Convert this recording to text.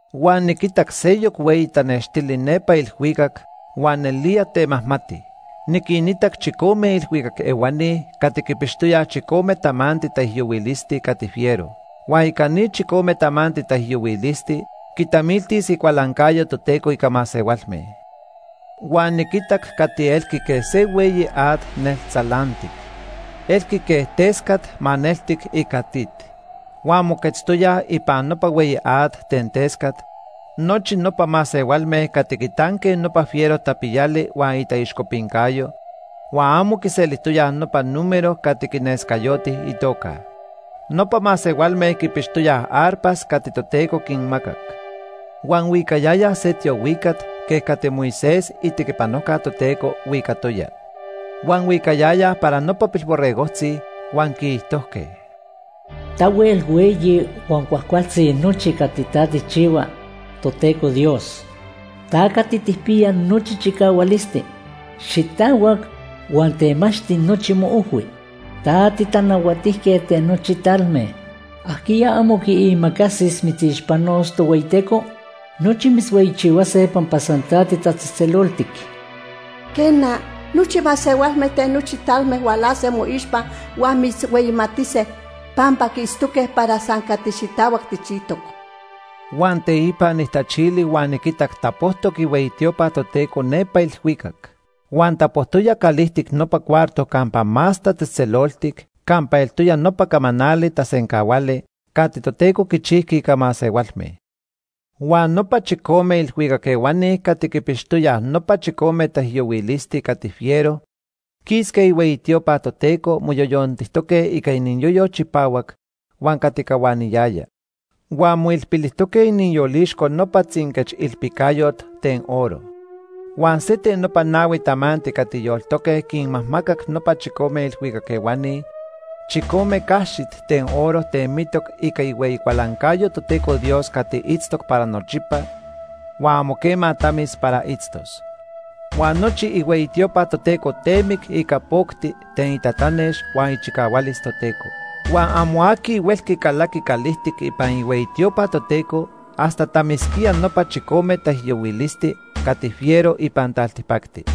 Huan niquitac seyoc hueyi tanextili nepa ilhuicac huan nelía temajmati. Niquinitac chicome ilhuicac ehuani cati quipixtoyaj chicome tamanti taijyohuilisti cati fiero. Huan ica ni chicome tamanti taijyohuilisti quitamiltis icualancayo Toteco ica masehualme. Huan niquitac cati elqui quej se hueyi at neltzalantic. Elqui quej tescat maneltic ica tit. Huan moquetztoyaj ipan nopa hueyi at ten tescat nochi nopa masehualme cati quitanque nopa fiero tapiyali huan itaixcopincayo, huan amo quiselijtoyaj nopa número cati quinescayoti itoca. Nopa masehualme quipixtoyaj arpas cati Toteco quinmacac. Huan huicayayaj se tiohuicat quej cati Moisés, itequipanojca Toteco, huicatoya. Huan huicayayaj para nopa Pilborregojtzi, huan quiijtojque: “Tahuel hueyi huan cuajcualtzi nochi cati ta tijchihua, Toteco Dios. Ta Cati Tijpiya Nochi Chicahualisti. Xitahuac huan temachti nochi moojhui. Ta tiTanahuatijquet ten nochi talme. ¿Ajquiya amo quiimacasis mitzixpanos, Tohueyiteco? Nochi mitzhueyichihuase pampa san ta titatzejtzeloltic. Quena, nochi masehualme ten nochi talme hualase moixpa huan mitzhueyimatise, pampa quiitztoque para san cati xitahuac tijchijtoc.” Huan teipa nijtachili huan niquitac tapojtoc ihueyi tiopa Toteco nepa ilhuicac. Huan tapojtoya calijtic nopa cuarto Campa Más Tatzejtzeloltic campa eltoya nopa camanali tasencahuali cati Toteco quichijqui ica masehualme. Huan nopa chicome ilhuicac ehuani cati quipixtoyaj nopa chicome taijyohuilisti cati fiero quisque ihueyi tiopa Toteco moyoyontijtoque ica iniyoyo chipahuac huan cati cahuaniyaya. Huan moilpilijtoque iniyolixco nopa tzinquechilpicayot ten oro. Huan se ten nopa nahui tamanti cati yoltoque quinmajmacac nopa chicome ilhuicac ehuani chicome caxit ten oro temitoc ica ihueyi cualancayo Toteco Dios cati itztoc para nochipa huan amo quema tamis para itztos. Huan nochi ihueyi tiopa Toteco temic ica pocti ten itatanex huan ichicahualis Toteco. Huan amo aqui huelqui calaqui calijtic ipan ihueyi tiopa Toteco hasta tamisquía nopa chicome taijyohuilisti cati fiero ipan taltipacti.